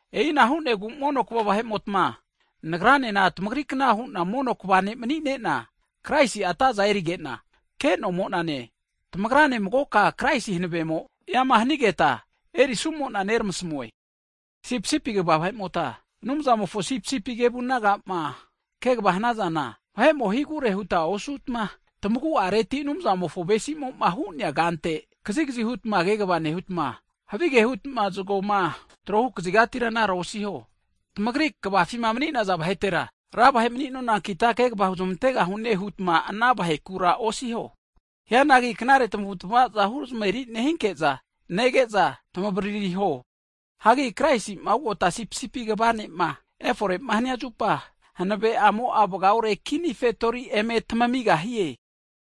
E'ina hu'negu mono kva vahe'motma, nagranena tamagrikna huna mono kva ne' mni'nena, Kraisi'a atazana erigena, ke'nomonane, tamagrane magoka Kraisi hanavemo eama hanigeta erisumona neramasamue. Sipisipi kva vahemota, Anumzamofo sipisipi kevu nagama kegvama hanazana, vahe'mo higure huta osutma tamaguareti Anumzamofo avesi'mo'ma hu'nea kante kazigazi hutma kegva nehutma, havige hutma zgoma tro hukazigatira anara osiho. Tamagri kvafima mni'naza vahetera, ra vahe mni'nonankita kegva huzmantegahune hutma ana vahekura osiho. Hianagi knare tamavutmavaza huzmaveri nehinke'za nege'za, tamavaririho. Hagi Kraisi'ma ugota Sipisipi kva ne'ma efore'ma hania zupa, hanave'amo'a vgaore kini fetori eme tamigahie.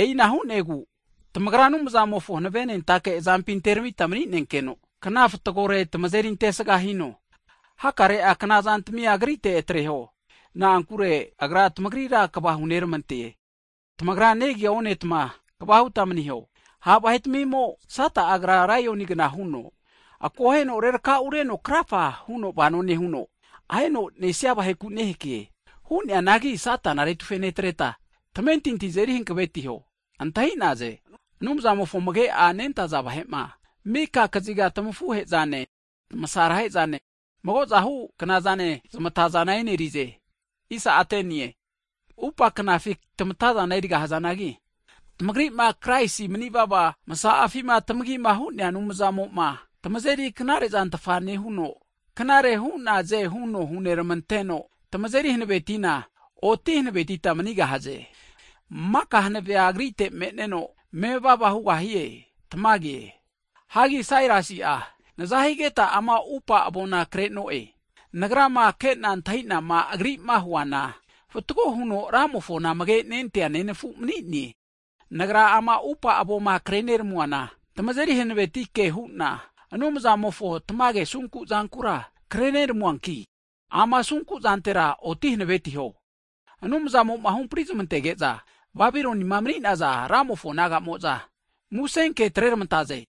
E'ina hu'negu tamagra Anumzamofo hanavenentake azampi anteramita mni'nenkeno, kna fatgore tamazeri antesga hino. Hakare'a knazantmia Agrite atreho, na'ankure Agra tamagrira kva huneramante. Tamagra negia onetma, kva hutma maniho. Ha' vahe'timimo Sata'a agra laionigna huno akoheno rerakaureno krafa huno vano nehuno, ahenoma nesia vaheku nehake. Hu'neanagi, tamentinti azeri hankavetineta, Satana retufe atreho. Antahi'naze, Anumzamofo amage nentaza vahe'ma, mika kaziga tmafuhe'zane tmasaro'zane magozahu knazane, zamata zana e'nerize. Hanki atupa'a knafi tamatazana erigahazanagi, tamagri'ma Kraisi manivava msa'afima tamagima hu'nea Anumzamo'ma tamazeri knaretfa nehuno, knare hu'naze huno huneramanteno, tamazeri hanavetina, oti hanavetita manigahaze. Maka hanavea Agrite me'neno, mevava hugahie. Tamage. Hanki Sailasi'a nazahigeta ama atupa avona kre'no'e, nagrama kena antahinama agri'ma huana, fatgo huno Ramofona amage nentea nenafu mni'ne. Nagra ama atupa avoma kreneramuana, tamazeri hanaveti ke hu'na, Anumzamofo tamage asunku zankura kreneramuanki, ana asunkuzantera oti hanavetiho. Anumzamo'ma huhampri zamantege'za, Babilonima mni'naza naga'mo'za, musenke atreramantaze.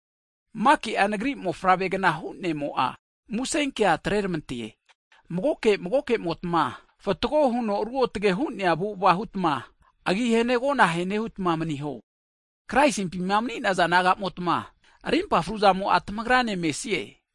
Maki'a nagri mofavreni'agna hu'nemo'a, musenkea atreramante. Magoke magokemotma fatgo huno ruotge hu'nea avu'ava hutma, agi hene agona ahene hutma maniho. Kraisimpima mni'naza nagamotma, rimpa fruzamo'a tamagrane mesie.